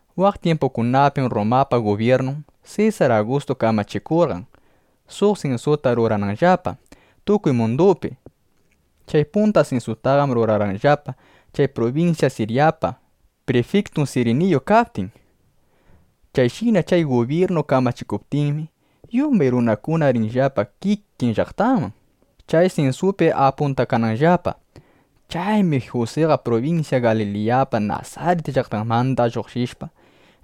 Waq tyimpukunapim Rrumapa gubyirnun Sesar Agustu kamachikurqan, suq sinsuta rurananllapa tukuy mundupi. Chay punta sinsutaqam rurarqanllapa, chay prubinsya Siryapa prifiktun Siriniyu kaptin. Chayshina chay gubyirnu kamachikuptinmi, yumbay runakuna riqllapa kikin llaqtanman, chay sinsupi apuntakananllapa. Chaymi Jusiqa prubinsya Galiliyapa Nasarit llaqtanmanda lluqshishpa,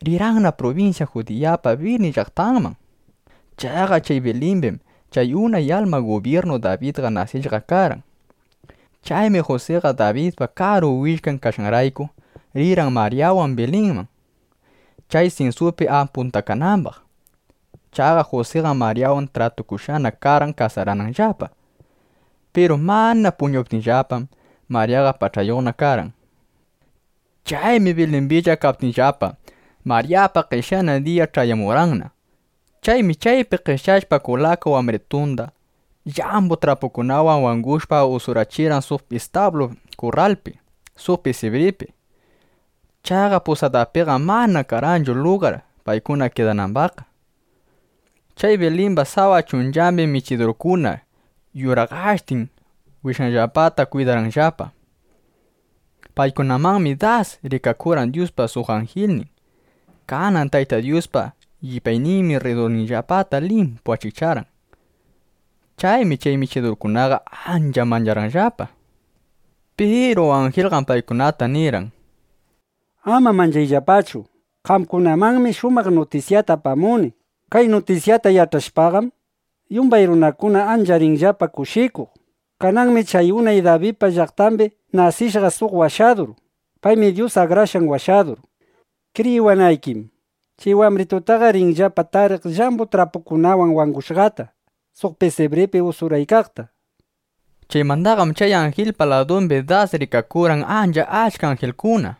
rirqanna prubinsya Judiyapa Bilin llaqtanman. Chaqa chay Bilimbim chay unay alma gubyirnu Dabidqa nasishqa karqan. Chaymi Jusiqa Dabidpa karu willkan kashqanrayku, rirqan Maryawan Bilinman, chay sinsupi apuntakanambaq. Chaqa Jusiqam Maryawanqa tratukushqana karqan kasarananllapa. (Piru mana puñuptinllapam,) Maryaqa pach'ayuqna (ukuyuqna) karqan. Chaymi Bilimbilla kaykaptinllapa, Maryapa qeshyanan diya ch'ayamurqanna. Chaymi chaypi qeshyashpa kulaka wambritunda, llambu trapukunawan wangushpa, usurachirqan suq istablu kurralpi suq pisibripi. Chaqa pusadapiqam mana karqanchu lugar, paykuna kidanambaqqa. Chay Bilimba sawa chunchambim michidurkuna yuraqashtin wishanllapata kwidaykarqanllapa. Paykunamanmi das rikakurqan Dyuspa suq anjilnin. Kanan Tayta Dyuspa llipyayninmi rridurninllapata limpu achikcharqan. Chaymi chay michidurkunaqa ancha mancharqanllapa. Piru anjilqam paykunata nirqan: —Ama manchayllapachu. Qamkunamanmi ancha shumaq nutisyata apamuni. Kay nutisyata yach'ashpaqam, yumbay runakuna ancha rinllapa kushikuq. Kananmi chay unay Dabidpa llaqtambi nasishqa suq Washadur. Paymi Dyus Akrashqan Washadur. Kriyiwanaykim, chay wambritutaqa ringillapa tariq llambu trapukunawan wangushqata, suq pisibripi usuraykaqta, nishpa. Chaymandaqam chay anjilpa ladumbi das rikakurqan ancha achka anjilkuna.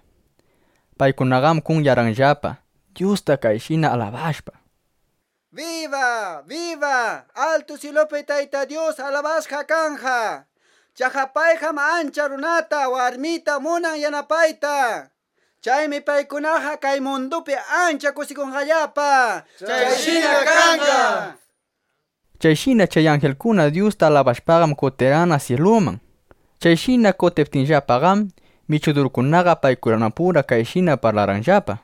Paykunaqam kunyarqanllapa, Dyusta kayshina alabashpa: —¡Biba, biba altu syilupi Tayta Dyus! ¡Alabashqa kanqa! ¡Chaqa payqam achka runata, warmita munan yanapayta! ¡Chaymi paykunaqa kay mundupi ancha kushikunqallapa! nishpa. Chayshina chay anjilkuna Dyusta alabashpaqam, kutirqanna syiluman. Chayshina kutiptinllapaqam, michidurkunaqa paykunapura kayshina parlarqanllapa: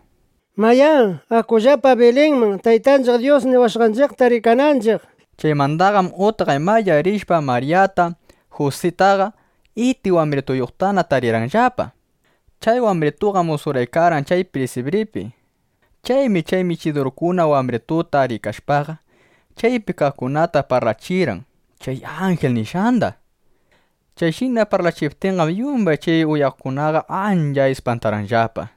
—Mayá, akullapa Bilinman, Taytanchiq Dyus niwashqanchiqta rikananchiq, imash' kashqa, nishpa. Chaymandaqam utqaymaya rishpa, Maryata, Jusitaqa, iti wambrituyuqtana tarirqanllapa. Chay wambritunqam usuraykarqan chay pisibripi. Chaymi chay michidurkuna wambrituta rikashpaqa, chaypi kaqkunata parlachirqan chay anjil nishqanda. Chayshina parlachiptinqam, yumbay chay uyaqkunaqa ancha ispantarqanllapa.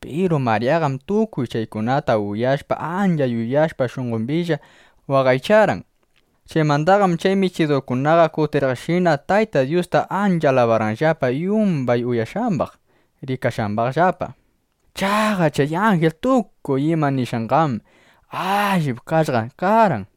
Piru Maryaqam tukuy chaykunata uyashpa, ancha yuyashpa, shunqombilla waqaycharqan. Chaymandaqam chay michidurkunaqa kutiriqshina Tayta Dyusta ancha alabarqanllapa yumbay uyashqambaq, rikashqambaqllapa. Chaqa chay anjil tukuy ima nishqanqam allip kashqa karqan.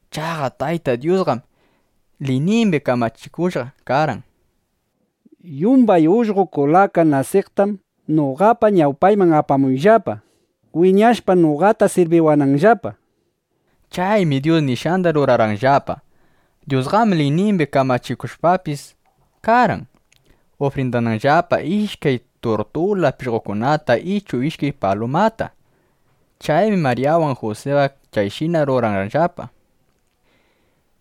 Chaqa Tayta Dyusqam liynimbi kamachikushqa karqan: “Yumbay ullqo kulaka nasiqtam noqapa ñawpayman apamuyllapa, wiñashpa noqata sirbiwananllapa”, nishpa. Chaymi Dyus nishqanda rurarqanllapa. Dyusqam liynimbi kamachikushqapis karqan, ufrindananllapa ishkay turtula pishqokunata ichu ishkay palumata. Chaymi Maryawan Jusiqa chayshina rurarqanllapa.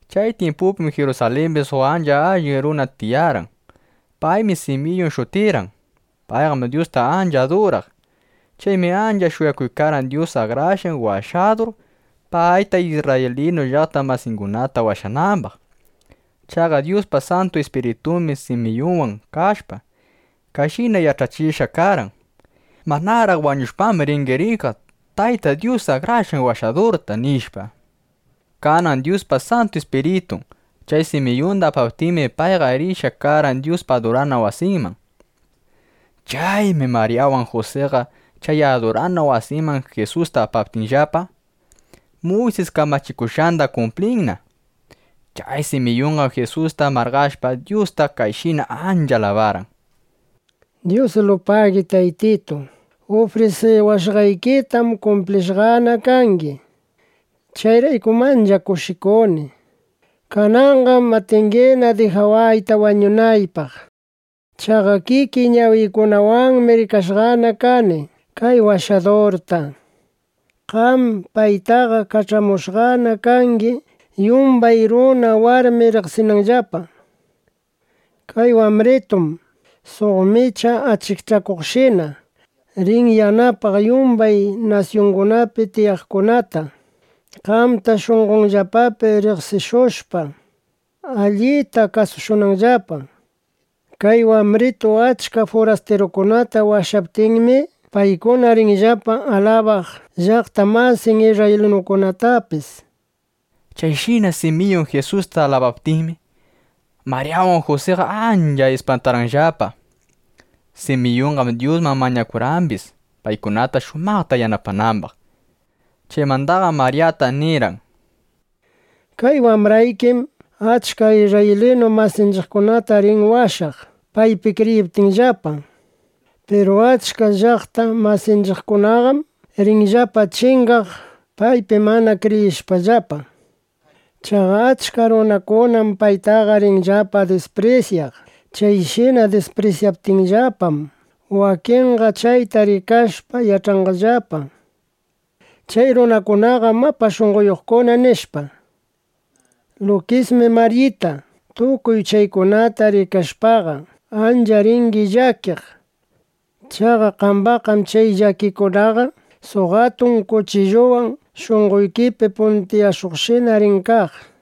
Chay tyimpupim Jirusalimbi suq ancha allin runa tiyarqan. Paymi Simiyun shutirqan. Payqam Dyusta ancha aduraq. Chaymi ancha shuyakuykarqan, Dyus Akrashqan Washadur payta, isrraylinu llaqta masingunata washanambaq. Chaqa Dyuspa Santu Ispiritunmi Simiyunwan kashpa, kayshina yach'achishqa karqan: “Manaraq wañushpam, ringi rikaq Tayta Dyus Akrashqan Washadurta”, nishpa. Kanan Dyuspa Santu Ispiritun chay Simiyunda apaptinmi, payqa rishqa karqan Dyuspa adurana wasinman. Chaymi Maryawan Jusiqa chay adurana wasiman Jisusta apaptinllapa, Muysis kamachikushqanda kumplinan, chay Simiyunqa Jisusta marqashpa, Dyusta kayshina ancha alabarqan: Dyusilupagi Taytitu; ufrisiwashqaykitam kumplishqana kangi. Chayraykum ancha kushikuni. Kananqam atingina dijawayta wañunaypaq. Chaqa kikiy ñawiykunawanmi rikashqana kani kay Washadurta. Qam paytaqa kach'amushqana kangi, yumbay runa, warmi riqsinanllapa. Kay wambritum suq micha achikchakuqshina rin yanapaq yumbay nasyungunapi tiyaqkunata, qamta shunqonllapapi riqsishushpa, allita kasushunanllapa. Kay wambritu achka furastirukunata washaptinmi, paykuna rinllapa alabaq llaqta masin isrraylinukunatapis, nishpa. Chayshina Simiyun Jisusta alabaptinmi, Maryawan Jusiqa ancha ispantarqanllapa. Simiyunqam Dyusman mañakurqambis, paykunata shumaqta yanapanambaq. Chaymandaqam Maryata nirqan: —Kay wambraykim achka isrraylinu masinchiqkunata rin washaq, paypi kriyiptinllapa. Piru achka llaqta masinchiqkunaqam rinllapa chingaq, paypi mana kriyishpallapa. Chaqa achka runakunam paytaqa rinllapa disprisyaq. Chayshina disprisyaptinllapam, wakinqa chayta rikashpa, yach'anqallapa: Chay runakunaqam mapa shunqoyuqkuna, nishpa. Lukismi Maryita, tukuy chaykunata rikashpaqa, ancha ringi llakiq. Chaqa qambaqqam chay llakikunaqa suq atun kuchilluwan shunqoykipi puntiyashuqshina rin kaq, nishpa.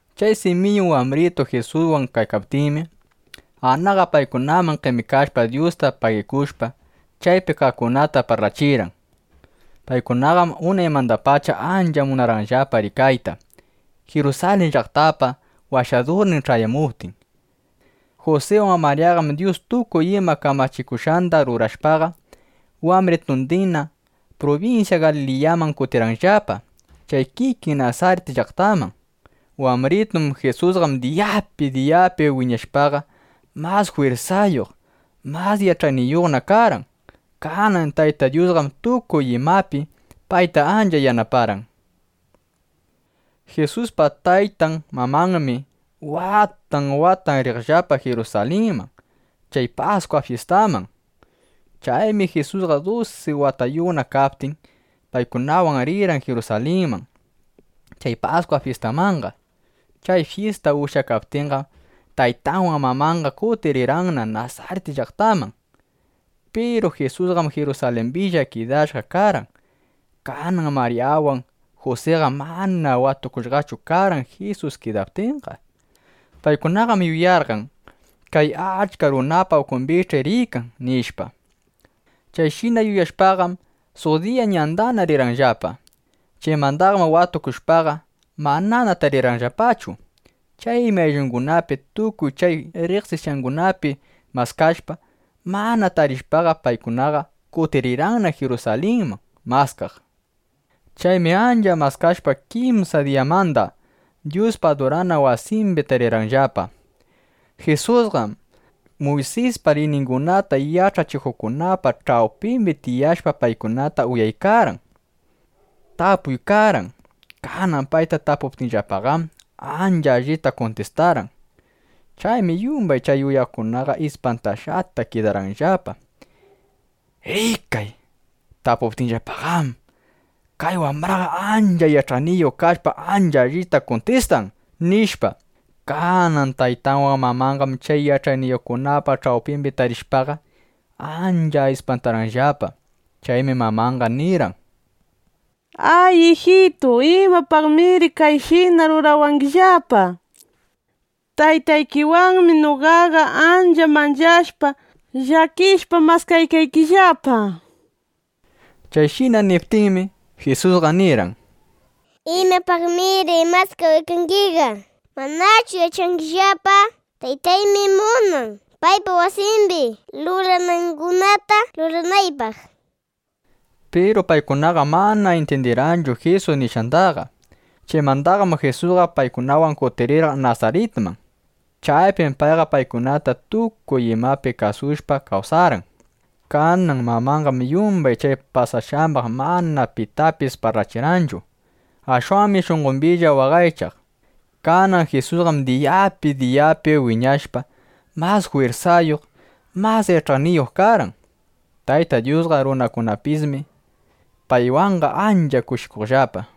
Chay Simiyun wambritu Jisuswan kaykaptinmi, Anaqa paykunaman qemikashpa, Dyusta pagikushpa, chaypi kaqkunata parlachirqan. Paykunaqam unaymandapacha ancha munarqanllapa rikayta, Jirusalin llaqtapa Washadurnin ch'ayamuptin. Jusiwan Maryaqam, Dyus tukuy ima kamachikushqanda rurashpaqa, wambritundinna prubinsya Galiliyaman kutirqanllapa chay kikin Nasarit llaqtanman. Wambritun Jisusqam diyapi diyapi wiñashpaqa, mas jwirsayuq, mas yach'ayniyuqna karqan. Kanan Tayta Dyusqam tukuy imapi payta ancha yanaparqan. Jisuspa taytan mamanmi watan watan riqllapa Jirusalinman chay Paskwa fyistaman. Chaymi Jisusqa dusi watayuqna kaptin, paykunawan rirqan Jirusalinman chay Paskwa fyistamanqa. Chay fyista ushyakaptinqam, taytanwan mamanqa kutiriykarqanna Nasarit llaqtaman. Piru Jisusqam Jirusalimbilla kidashqa karqan. Kanan Maryawan Jusiqam mana watukushqachu karqan Jisus kidaptinqa. Paykunaqam yuyarqan: Kay achka runapa ukumbich'i riykan, nishpa. Chayshina yuyashpaqam, suq diya ñandana rirqanllapa. Chaymandaqam watukushpaqa, manana tarirqanllapachu. Chaymi ayllungunapi, tukuy chay riqsishqangunapi maskashpa, mana tarishpaqa, paykunaqa kutirirqanna Jirusalinman maskaq. Chaymi ancha maskashpa, kimsa diyamanda Dyuspa adurana wasimbi tarirqanllapa. Jisusqam Muysispa liyningunata yach'achikuqkunapa ch'awpimbi tiyashpa, paykunata uyaykarqan, tapuykarqan. Kanan payta tapuptinllapaqam, ancha allita kuntistarqan. Chaymi yumbay chay uyaqkunaqa ispantashqata kidarqanllapa: ¡Rikay, tapuptinllapaqam, kay wambraqa ancha yach'ayniyuq kashpa, ancha allita kuntistan! nishpa. Kanan taytanwan mamanqam chay yach'ayniyuqkunapa ch'awpimbi tarishpaqa, ancha ispantarqanllapa. Chaymi mamanqa nirqan: —Ay, ijitu, ¿imapaqmir kayshina rurawangillapa? Taytaykiwanmi noqaqa ancha manchashpa, llakishpa, maskaykaykillapa. Chayshina niptinmi, Jisusqa nirqan: —¿Imapaqmir maskawaykangiqa? ¿Manachu yach'angillapa: Taytaymi munan, paypa wasimbi ruranangunata ruranaypaq, nishpaqa? Piru paykunaqam mana intyindirqanchu Jisus nishqandaqa. Chaymandaqam Jisusqa paykunawan kutirirqan Nasaritman. Chaypim payqa paykunata tukuy imapi kasushpa kawsarqan. Kanan mamanqam yumbay chay pasashqambaq mana pitapis parlachirqanchu. Ashwanmi shunqombilla waqaychaq. Kanan Jisusqam diyapi, diyapi wiñashpa, mas jwirsayuq, mas yach'ayniyuq karqan. Tayta Dyusqa, runakunapismi paywanqa ancha kushikuqllapa.